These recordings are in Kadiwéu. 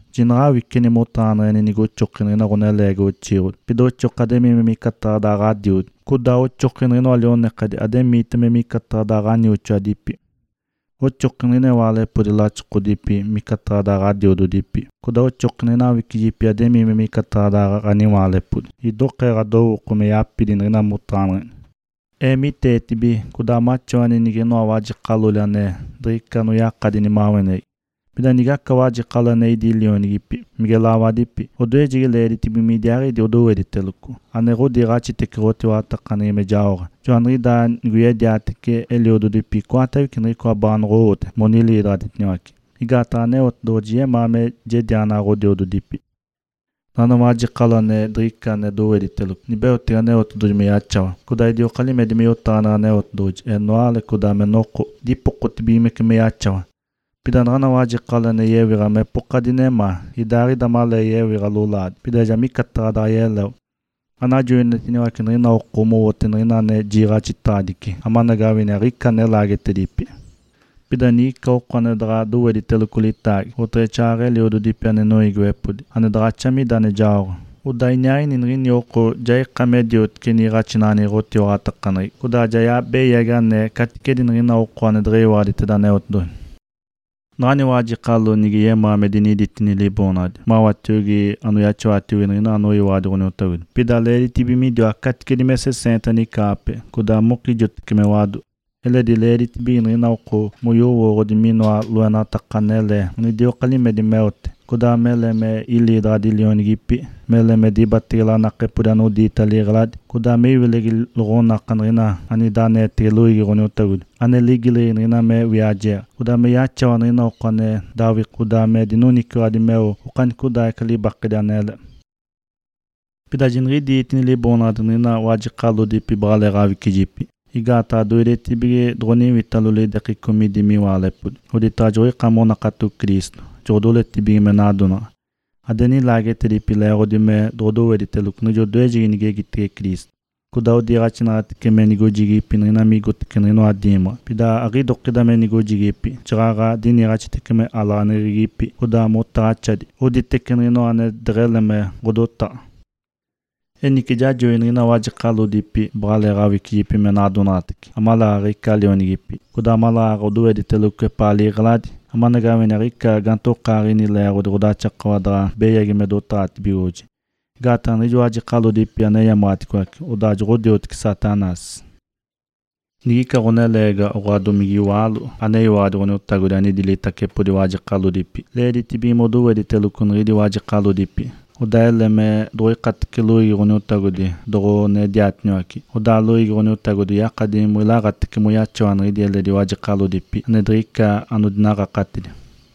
Jinaɡ̶awiceni motaɡ̶aneɡ̶eni nigoxoki niɡ̶ina ɡ̶oneleegiwa oxiiɡ̶odi, pida oxoki ademii micataɡ̶a daɡ̶a ɡ̶adiodi. Codaa oxoki niɡ̶inoa lionekadi ademiita micataɡ̶a daɡ̶a ɡ̶anioxoadipi. Oxoki niɡ̶ina iwaalepodi laxokodipi micataɡ̶a daɡ̶a ɡ̶adiododipi. Codaa oxoki niɡ̶ina awicijipi mademii micataɡ̶a daɡ̶a ɡ̶aniwaalepodi, midokee ɡ̶adowooko me yapidi niɡ̶ina motaɡ̶aneɡ̶eni. Eemiteetibige codaa maxawani niɡ̶inoa wajekalodipi ane diɡ̶ica anoyakadi nimaweneɡ̶egi. Pida nigaca wajekalo ane idi lionigipi, mige lawadipi, odoejegi leeditibige midiaaɡ̶idi odowediteloco, ane ɡ̶odiiɡ̶axitece ɡ̶otiwaɡ̶atakaneɡ̶egi me jaoɡ̶a. Joaniɡ̶idaa nigoyediatece eliododipi icoatawece niɡ̶icoa baanoɡ̶owote moniliidaɡ̶aditiniwace. Igaataɡ̶a Aneotedoɡ̶oji yemaa me jedianaɡ̶a ɡ̶odiododipi. Naɡ̶ana wajekalo ane diɡ̶ica ane dowediteloco, nibeotege Aneotedoɡ̶oji me yaxawa, codaa idioka limedi me yotaɡ̶aneɡ̶e Aneotedoɡ̶oji, enoale, codaa me noko, dipokotibigimece me yaxawa. Pida naɡ̶ana wajekalo ane yewiɡ̶a mepoka dinemaa, idaaɡ̶ida malee yewiɡ̶a lolaadi, pida ja micataɡ̶a daantaɡ̶a yeleo. Anajoinitiniwace niɡ̶ina oko mowote niɡ̶inoa ane jiiɡ̶axitedaɡ̶adici, amanagawini aɡ̶ica ane laagetedipi. Pida nigica oko ane daɡ̶a dowediteloco litaagi, oteɡ̶exaaɡ̶aɡ̶a eliododipi ane noiigiwepodi, ane daɡ̶axa mida ane jaoɡ̶a, odaa iniaaɡ̶ini niɡ̶ini oko ja ika me diotece niiɡ̶axinaɡ̶aneɡ̶egi ɡ̶otiwaɡ̶atakaneɡ̶egi, codaa ja beyagi anee caticedi niɡ̶ina oko ane deɡ̶eyiwaɡ̶aditeda Ǥoniotagodi. Naɡ̶ana wajekalo nige yemaa me diniditini liboonaɡ̶adi mawatiogi anoyaxawatiogi niɡ̶ina anoyiwaɡ̶adi Ǥoniotagodi, pida leeditibige midiwa caticedi me seseenta nicaaɡ̶ape, codaa mokijotece me wado. Eledi leeditibige niɡ̶ina oko moyowooɡ̶odi minoa loenataka anele anidioka limedi meote, codaa mele me iliidaɡ̶adi lionigipi, mele me dibatege lanakepodi anodiita liɡ̶eladi, codaa me iwilegi loɡ̶onaka niɡ̶ina anida aneetege loiigi Ǥoniotagodi (ane ligileɡ̶egi niɡ̶ina me wiajeeɡ̶a), me yaxawa niɡ̶ina oko ane dawikode, codaa me dinoniciwaɡ̶adi meo okanicodaaɡ̶ica libakedi anele. Pida jiniɡ̶idiitini liboonaɡ̶adi niɡ̶ina wajekalodipi baɡ̶aleeɡ̶awicijiipi. Igaataɡ̶a doidetibige doɡ̶oniwitalo lidekeco midi miwaalepodi, oditaɡ̶a joɡ̶oika monakato Cristo, joɡ̶odoletacibige me nadonaɡ̶a. Ade nilaagetedipi leeɡ̶odi me doɡ̶odowediteloco niɡ̶ijo odoejegi nigegitege Cristo. Codaa odiniiɡ̶axitece me nigojigipi niɡ̶ina migotece niɡ̶inoa diimaɡ̶a. Pida aɡ̶idokida me nigojigipi, jaɡ̶aɡ̶a diniiɡ̶axitece me alaɡ̶aneɡ̶egipi, codaa motaɡ̶axadi, oditece niɡ̶inoa ane deɡ̶ele me ɡ̶odotaɡ̶a. Enice jajoi niɡ̶ina wajekalodipi baɡ̶alee awicijipi me nadonaɡ̶atace, amaleeɡ̶aɡ̶a ica lionigipi, codaa amaleeɡ̶aɡ̶a odowediteloco epaa liɡ̶eladi, amanagawini aɡ̶ica gaantokaaɡ̶ini leeɡ̶odi ɡ̶odaxakawa daɡ̶a beyagi me dotaɡ̶atibigoɡ̶oji. Igaataɡ̶a jiɡ̶ijo wajekalodipi aneyamaɡ̶aticoace, odaa joɡ̶odioteci Satanás. Nigica ɡ̶oneleegiwa, oɡ̶oa domige iwaalo aneyiwaɡ̶adi Ǥoniotagodi anidi litacepodi wajekalodipi, leeditibige modowediteloco niɡ̶idi wajekalodipi, odaa ele me doɡ̶oikatece loiigi Ǥoniotagodi doɡ̶onediatiniwace. Odaa loiigi Ǥoniotagodi yakadi moilaaɡ̶atece moyaxawa niɡ̶ina eledi wajekalodipi ane diɡ̶ica anodinaɡ̶akatidi.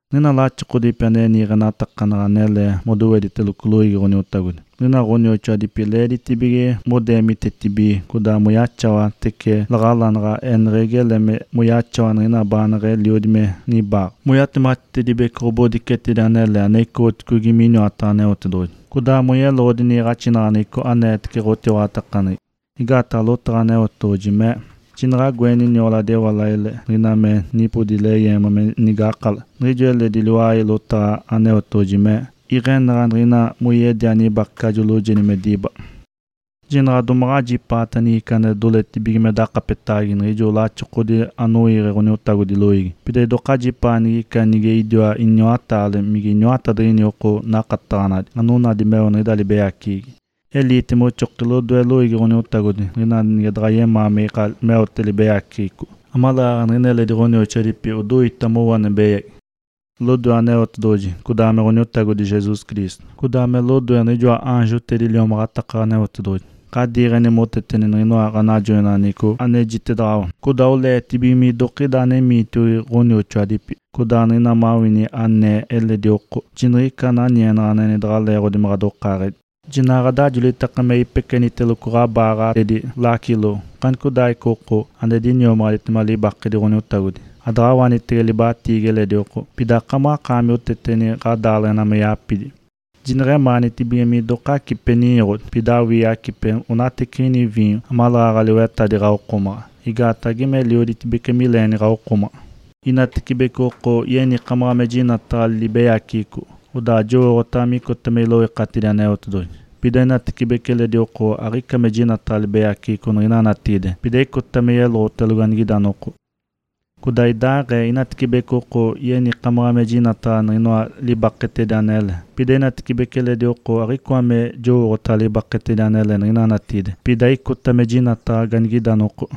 Niɡ̶ina laxokodipi ane niiɡ̶enatakanaɡ̶a anele modowediteloco loiigi Ǥoniotagodi, niɡ̶ina ɡ̶onioxoadipi leeditibige modeemitetibige codaa moyaxawatece laɡ̶alanaɡ̶a, eneɡ̶egi ele moyaxawa niɡ̶ina baaneɡ̶eliodi me nibaaɡ̶a, moyatematitedibece ɡ̶obodicetedi anele ane icoɡ̶otedigi miniwataɡ̶a Aneotedoɡ̶oji, codaa moyeloɡ̶odi niiɡ̶axinaɡ̶aneɡ̶eco aneetece ɡ̶otiwaɡ̶atakaneɡ̶egi. Igaataɡ̶a lotaɡ̶a Aneotedoɡ̶oji mee, “Jinaɡ̶a agoeni nioladi ewalaile niɡ̶ina me nipodi leyeema me nigakala.” Niɡ̶ijo eledi liwai lotaɡ̶a Aneotedoɡ̶oji mee, “Iɡ̶enaɡ̶a niɡ̶ina moyedia nibakecajo loojedi me diba.” Jinaɡ̶a domaɡ̶a ajipaata nigica ane doletibige me dakapetege niɡ̶ijo laxokodipi anoiiɡ̶e Ǥoniotagodi loiigi. Pida idoka ajipaata niɡ̶ina nige idiwa iniwataale mige iniwatadiɡ̶ini oko nakataɡ̶anadi, anonadi meo anigida libeyaceɡ̶egi. Eliite moxoki lodoe loiigi Ǥoniotagodi niɡ̶ina ane daɡ̶a yemaa me ika meotibiga libeyaceɡ̶eco, amaleeɡ̶aɡ̶a niɡ̶ina eledi ɡ̶onioxoadipi odoita mowo ane beyagi. Lodoe Aneotedoɡ̶oji, codaa me Ǥoniotagodi Jesus Cristo, codaa me lodoe niɡ̶ijoa aanjotedi liomaɡ̶ataka Aneotedoɡ̶oji, ɡ̶adiiɡ̶eni moteteni niɡ̶inoa ɡ̶anajoineɡ̶eco anejitedaɡ̶awa. Codaa oleetibige midokida anemiitiogi ɡ̶onioxoadipi, codaa niɡ̶ina mawini anee eledi oko, jiniɡ̶ica ananienaɡ̶aneɡ̶eni daɡ̶a leeɡ̶odi me ɡ̶adokaaɡ̶edi. Jinaɡ̶a ɡ̶adajolitaki me ipekeniteloco ɡ̶abaaɡ̶atedi lacilo okanicodaaɡ̶ica oko ane diniomaɡ̶aditema libakedi Ǥoniotagodi. Adaɡ̶awanitege libatiigi eledi oko. Pida akamaɡ̶akaami oteteni ɡ̶adaaleɡ̶ena me yapidi. Jineɡ̶emaanitibige minoka acipeta ninyoɡ̶odi, pida awii acipeta onateciɡ̶ida viinyo amaleeɡ̶aɡ̶a liwetadi ɡ̶awokomaɡ̶a, igaataɡ̶a geme elioditibece mileeni ɡ̶awokomaɡ̶a. Inatibece oko yenikamaɡ̶a me jinataɡ̶a libeyaceɡ̶eco, odaa jowooɡ̶otaɡ̶a micota me iloikatidi Aneotedoɡ̶oji. Pida inatecibece eledi oko aɡ̶icoa me jinataɡ̶a libeyaceɡ̶eco niɡ̶ina natigide, pida icota me yeloɡ̶otelogo anigida noko. Codaa idaaɡ̶ee, inatecibece oko yenikamaɡ̶a me jinataɡ̶a minoa libaketedi anele, pida inatecibece eledi oko aɡ̶icoa me jowooɡ̶otaɡ̶a libaketedi anele niɡ̶ina natigide, pida icota me jinataɡ̶a anigida noko.